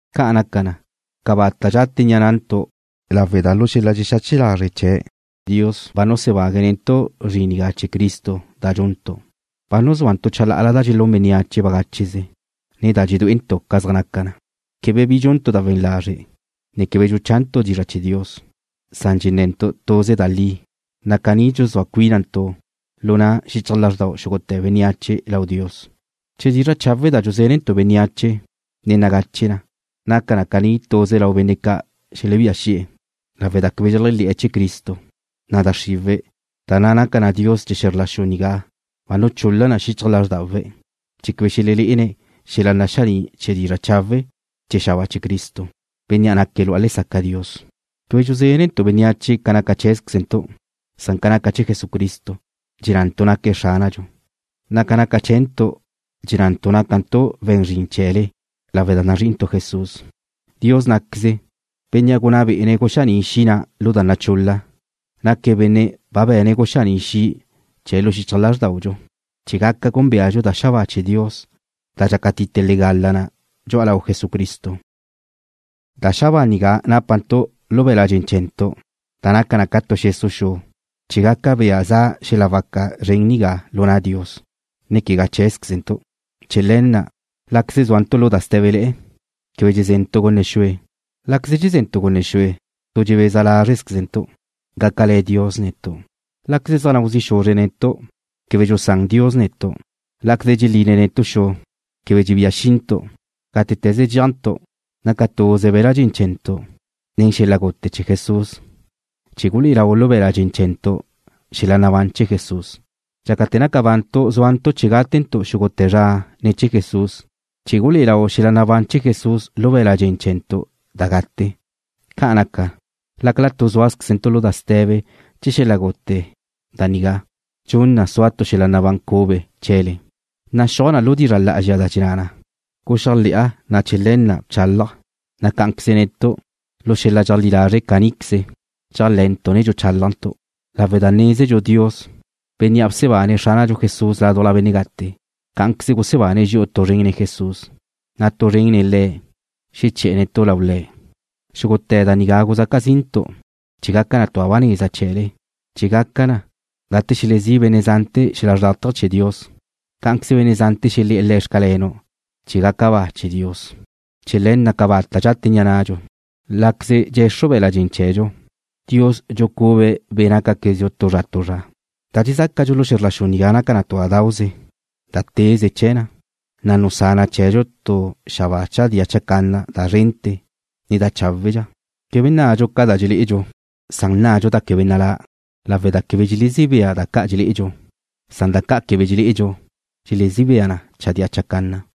Ca' naca na, cabata' dxate ni'a nantu' lawe' da lu xel-la dxexache lazre' chee̱', Dios ba nusebague̱' netu' zrin nigá chee̱ Cristo da dxuntu'. Ba nuzúantu' chalá'ala da dxelún bénneache bagácheze, ne da dxedué'entu' ca zaj naca na. Quebe bi dxuntu' da we̱n lazre', ne quebe dxuchantu' dizra' chee̱ Dios, san dxenne̱ntu' tuze da li, na' caní dxuzúa cuínantu' lu na' xichaj lázrdau xúgute̱ bénneache lau Dios. Che dizra' chawe' da dxuzénentu' bénneache ne nagache na, naca na caní tuze lau benne' ca' xelebía xi'e̱. Lawe' da quebe dxeléajle̱'e̱ chee̱ Cristo, na' da xriwe̱', da na' naca na dios chee̱ xe̱zr la xu nigá ba nun chul-la na xichaj lázrdawe̱' chee̱ quebe xelelé'ene̱' xel-la naxaní' chee̱ dizra' chawe' chee̱ xabáa chee̱ Cristo, Bénnea' naque̱' lu'a lesaca Dios. Quebe dxuzénentu' bénneache ca naca cheé̱zquezentu', san ca naca chee̱ Jesucristo. Dxennantu' naque̱' Xránadxu, na' ca naca chee̱ntu' dxennantu' nácantu' we̱n zrin chee̱le lawe' da nazrí'intu' Jesús. Dios ná'queze, Bénnea' gunná be'e̱ guxaní' xi' na' lu da chul-la, naque̱' Benne' ba be̱ne̱' guxaní' xi' chee̱' lu xichaj lázrdaudxu, chee̱ gaca gúnbeadxu da xabáa chee̱ Dios da dxácatite legala na dxu'a lau Jesucristo. Da xabáa nigá nápantu' lu be̱la' dxen chee̱ntu', da naca na ca tu xesu' xu, chee̱ gaca bea za xel-la waca zren nigá lu na' Dios, ne quegá cheé̱zquezentu'. Chee̱ le̱ na': Láqueze zúantu' lu da sté̱bele̱'e̱, quebe dxeze̱ntu' gunne xue. Láqueze dxeze̱ntu' gunne xue, tu dxebeza lázrezquezentu' gácale̱ Dios netu'. Láqueze zaj nau zi' xuzre̱' netu', quebe dxusán Dios netu'. Láqueze dxeline̱' netu' xu, quebe dxebía xintu'. Gátete̱ze dxéajntu' naca tuze be̱la' dxen chee̱ntu' nen xel-la gute chee̱ Jesús chee̱ gulé'e lau lu be̱la' dxen chee̱ntu' xel-la nabán chee̱ Jesús. Dxácate̱ naca bantu' zúantu' chee̱ gátentu' xúgute̱ zra ne̱ chee̱ Jesús, chee̱ gulé'e lau xel-la nabán chee̱ Jesús lu be̱la' dxen chee̱ntu' da gate. Ca' naca na, lácala tu zúazquezentu' lu da ste̱be chee̱ xel-la gute da nigá, dxun na sua tu xel-la nabán cube chee̱le. Naxúaj lu dizra' lá'azxa da dxenná na: Guxéajle̱'a, na' chee̱ le̱ na' bchálaja', na' cá'anqueze netu', lu xel-la dxeajlí lazre' caníqueze, dxéajle̱'e̱ntu', ne dxuchálajntu', lawe' da nézentu' Dios, Bénnea' bsebane̱' Xránadxu Jesús ládujla benne' gate, cá'anqueze gusebane̱' dxi'u tu zren nen Jesús, na' tu zren nen le'e, xeché̱'e̱ dxi'u lau Le̱'. Xúgute̱ da nigá guzaca zintu' chee̱ gaca tu da ba neza chee̱le, chee̱ gaca na, gate xelezí' benne' zante̱ xel-la xrlátaje chee̱ Dios, cá'anqueze benne' zante̱ xelé̱'e̱ Le̱': Xcalenu', chee̱ gaca ba chee̱ Dios. Chee̱ le̱ na', cabata' dxate ni'a nadxu. Láqueze dxe̱xru be̱la' dxen chee̱dxu, Dios dxuxucube̱' be' nácaquezdxu tu zra tu zra. Da dxezácadxu lu xe̱zr la xu nigá naca na tu da dauze, da teze chee̱ na, na' nusá na chee̱dxu tu xabáa chadía chacanna da szrente̱, ne da cháwedxa. Quebe nná'adxu ca da dxelé'edxu, san nná'adxu da quebe nalá', lawe' da quebe dxelezí bea da ca' dxelé'edxu, san da ca' quebe dxelé'edxu dxelezí bea na chadía chacanna.